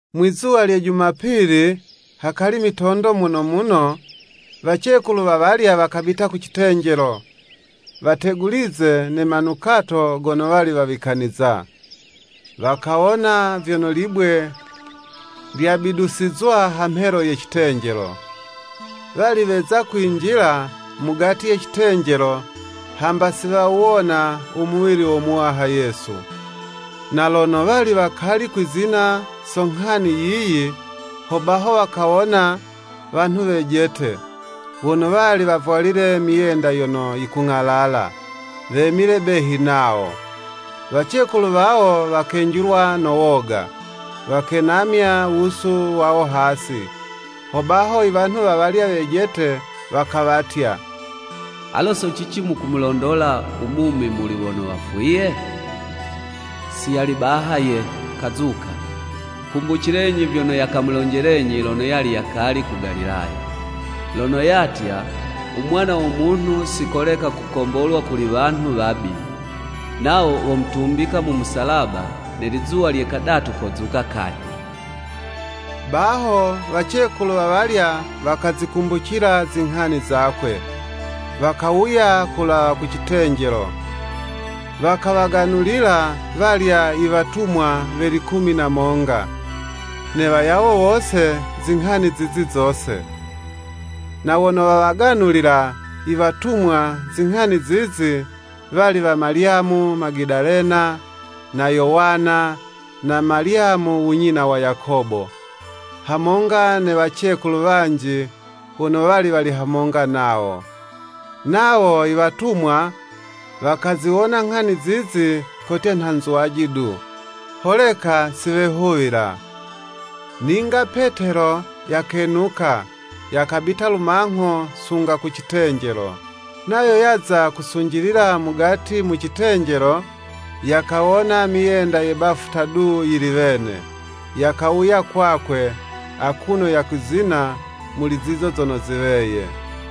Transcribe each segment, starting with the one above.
Mwizuwa lye Jumapili, hakali mitondo muno muno, wacekulu wawalya wakabita ku citenjelo, wategulize ne manukato gono wali wawikaniza. Wakawona vyono libwe lyabidusizwa hamhelo ye citenjelo. Wali weza kwinjila mugati ye citenjelo, hamba siwawuwona u muwili wo Muwaha Yesu. Na lono wali wakali kwizina so nghani yiyi, hobaho wakawona wanhu wejete, wono wali wavwalile myenda yono yikung'alala, wemile behi nawo. Wacekulu wawo wakenjilwa no woga, wakenamya wusu wawo hasi. Hobaho i wanhu wawalya wejete wakawatya, “Alo so cici mukumulondola u mumi muli wono wafwiye? Si yali baha ye, kazuka, kumbucilenyi vyono yakamulonjelenyi lono yali yakali ku Galilaya; lono yatya, u Mwana wo Munhu si koleka kukombolwa kuli wanhu wabi, nawo womutumbika mu musalaba ne lizuwa lye kadatu kozuka kanyhi.” Baho wacekulu wawalya wakazikumbucila zinghani zakwe. Wakawuya kulawa ku citenjelo, wakawaganulila walya i watumwa we likumi na monga, ne wayawo wose, zinghani zizi zose. Na wono wawaganulila iwatumwa zinghani zizi, wali wa Malyamu Magadalena, na Yowana, na Malyamu u nyina wa Yakobo: hamonga ne wacekulu wanji, wono wali wali hamonga nawo. Nawo i watumwa wakaziwona nghani zizi kotya nha nzwaji du, holeka si wehuwila. Ninga Petelo yakenuka, yakabita lumangho sunga ku citenjelo. Nayo yaza kusunjilila mugati mu citenjelo, yakawona myenda ye bafuta du yili wene. Yakawuya kwakwe, akuno yakwizina muli zizo zono ziweye.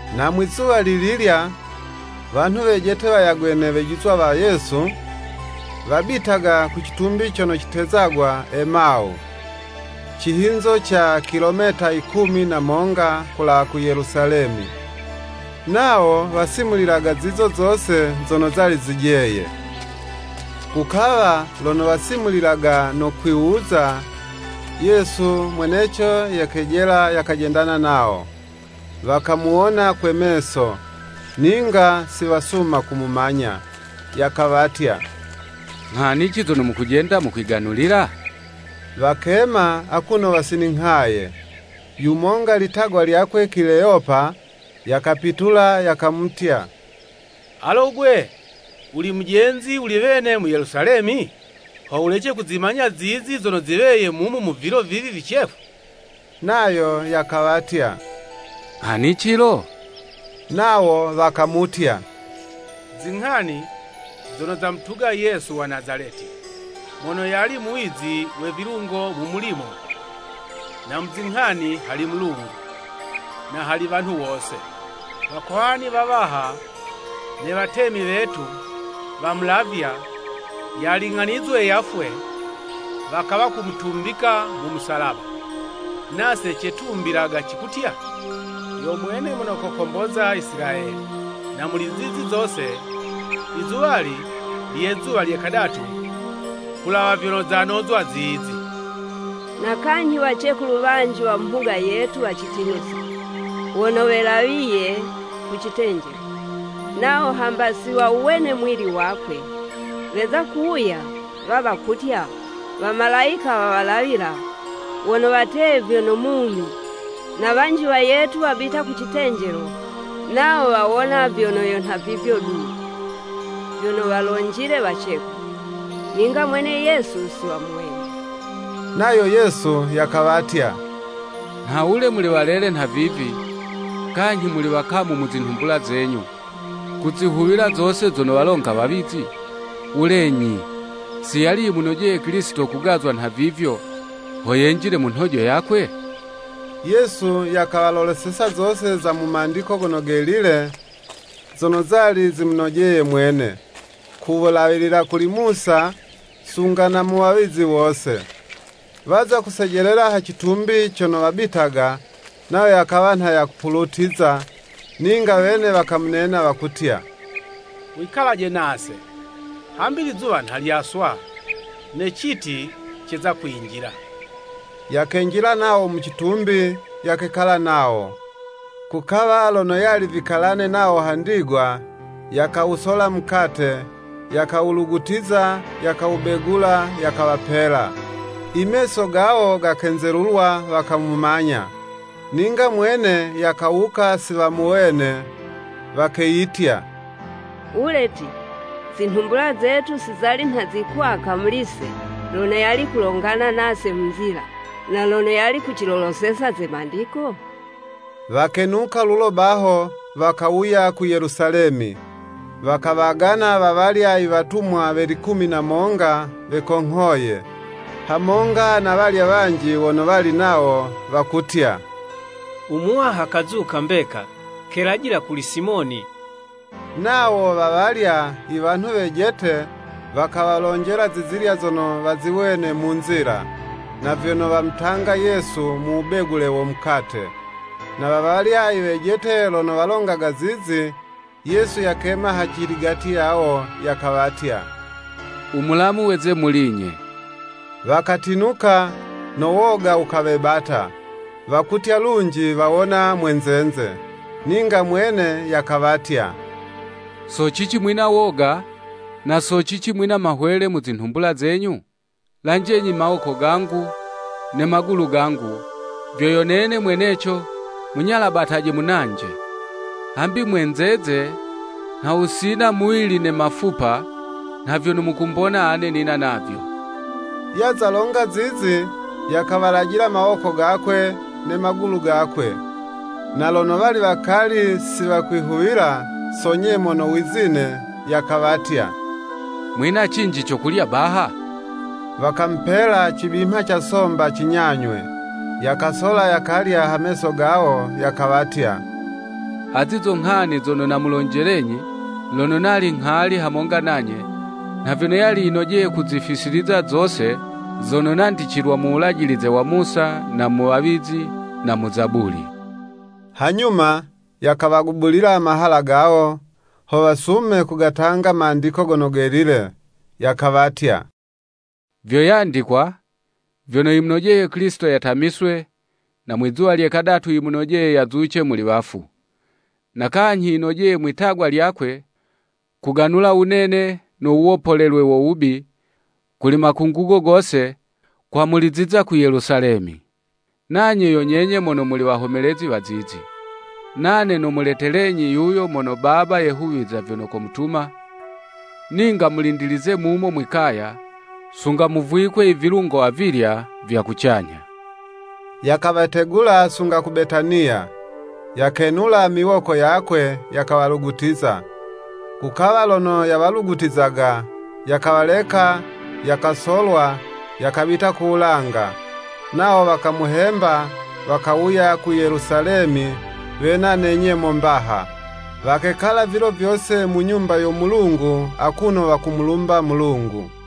Na mwizuwa lililya, wanhu wejete wayagwe ne wejizwa wa Yesu, wabitaga ku citumbi cono catezagwa Emawu, cihinzo ca kilometa yikumi na monga kulawa ku Yelusalemi. Nawo wasimulilaga zizo zose zono zali zijeye. Kukawa lono wasimulilaga no kwiwuza, Yesu mweneco yakejela yakajendana nawo. Wakamuwona kwe meso, ninga si wasuma kumumanya. Yakawatya, “Nghanici zono mukujenda mukwiganulila?” Wakema akuno wasininghaye. Yumonga litagwa lyakwe Kileyopa, Yakapitula yakamutya, “Alo 'gwe wuli mujenzi wuli wene mu Yelusalemi, ho wulece kuzimanya zizi zono ziweye mumu mu vilo vivi vicefu?” Nayo yakawatya, “Nghanici lo?” Nawo wakamutya, “Zinghani zono zamutuga Yesu wa Nazaleti. Mono yali muwizi we vilungo mu mulimo, na mu zinghani hali Mulungu, na hali wanhu wose. Wakohani wawaha ne watemi wetu, wamulavya, yaling'anizwe yafwe, wakawa kumutumbika mu musalaba. Nase cetumbilaga cikutya, yo mwene mono kokomboza Isilayeli. Na muli zizi zose, izuwali lye zuwa lye kadatu kulawa vyono zanozwa zizi. Na kanyhi wacekulu wanji wa mu mhuga yetu wacitinusa, wono welawiye ku citenjelo. Nawo hamba si wawuwene muwili wakwe, weza kuwuya, wawa kutya, wamalayika wawalawila, wono wateye vyono mumi. Na wanji wayetu wabita ku citenjelo, nawo wawona vyono yo nha vivyo du, vyono walonjile wacekulu, ninga mwene Yesu si wamuwene.” Nayo Yesu yakawatya “Nhawule muli walele nhavivi, kanyhi muli wakamu mu zinhumbula zenyu, kuzihuwila zose zono walonga wawizi? Wulenyi, si yali yimunojeye Kilisito kugazwa nhavivyo, ho yenjile mu nhojo yakwe?” Yesu yakawaloloseza zose za mu Mandiko Gono Gelile, zono zali zimunojeye mwene, ku wulawilila kuli Musa, sunga na mu wawizi wose. Waza kusejelela ha citumbi cono wabitaga; nayo yakawa nha yakupulutiza, ninga wene wakamunena wakutya, “Wikalaje nase, hambi lizuwa nha lyaswa, ne citi ceza kwinjila.” Yakenjila nawo mu citumbi, yakekala nawo. Kukawa, lono yali vikalane nawo ha ndigwa, yakawusola mukate, yakawulugutiza, yakawubegula, yakawapela. I meso gawo gakenzelulwa, wakamumanya. Ninga mwene yakawuka si wamuwene. Wakeyitya, “Wule 'ti, zinhumbula zetu si zali nha zikwaka muli'se lono yali kulongana nase mu nzila, na lono yali kuciloloseza ze mandiko?” Wakenuka lulo baho, wakawuya ku Yelusalemi, wakawagana wawalya i watumwa we likumi na monga wekonghoye, hamonga na walya wanji wono wali nawo; wakutya “U Muwaha kazuka mbeka, kelajila kuli Simoni. Nawo wa walya i wanhu wejete, wakawalonjela zizilya zono waziwene mu nzila, na vyono wamutanga Yesu mu wubegule wo mukate.” Na wawalya i wejete lono walongaga zizi, Yesu yakema haciligati yawo, yakawatya, “U mulamu weze muli'nye.” wakatinuka, no woga wukawebata, wakutya lunji wawona mwenzenze. Ninga mwene yakawatya, “So cici mwina woga, na so cici mwina mahwele mu zinhumbula zenyu? Lanjenyi mawoko gangu ne magulu gangu, vyo yo nene mweneco, munyalabataje munanje; hambi mwenzeze nha wusina muwili ne mafupa, nha vyono mukumbona ane nina navyo.” Yaza longa zizi, yakawalajila mawoko gakwe, ne magulu gakwe. Na lono wali wakali si wakwihuwila so nyemo no wizine, Yakawatya “Mwina cinji co kulya baha?” Wakamupela cibimha ca somba cinyanywe. Yakasola yakalya ha meso gawo. Yakawatya, “Azi zo nghani zono namulonjelenyi, lono nali nghali hamonga nanye, nha vyono yali yinojeye kuzifisiliza zose, zono nandicilwa mu wulajilize wa Musa, na mu wawizi, na mu Zabuli.” Hanyuma yakawagubulila mahala gawo, ho wasume kugatanga Mandiko Gono Gelile. Yakawatya, “Vyo yandikwa, vyono yimunojeye Kilisito yatamiswe, na mwizuwa lye kadatu yimunojeye yazuce muli wafu. Na kanyhi yinojeye mwi'tagwa lyakwe, kuganula wunene, no wuwopolelwe wo wubi, kuli makungugo gose, kwamuliziza ku Yelusalemi. Nanye yo nyenye mono muli wahomelezi wa zizi. Nane nomuletelenyi yuyo mono Baba yehuwiza vyono komutuma, ninga mulindilize mumo mwi'kaya, sunga muvwikwe i vilungo avilya vya kucanyha.” Yakawategula sunga ku Betaniya, yakenula miwoko yakwe, yakawalugutiza. Kukawa lono yawalugutizaga, yakawaleka, yakasolwa, yakabita ku wulanga. Nawo wakamuhemba, wakawuya ku Yelusalemi wena ne nyemo mbaha, wakekala vilo vyose mu Nyumba yo Mulungu akuno wakumulumba Mulungu.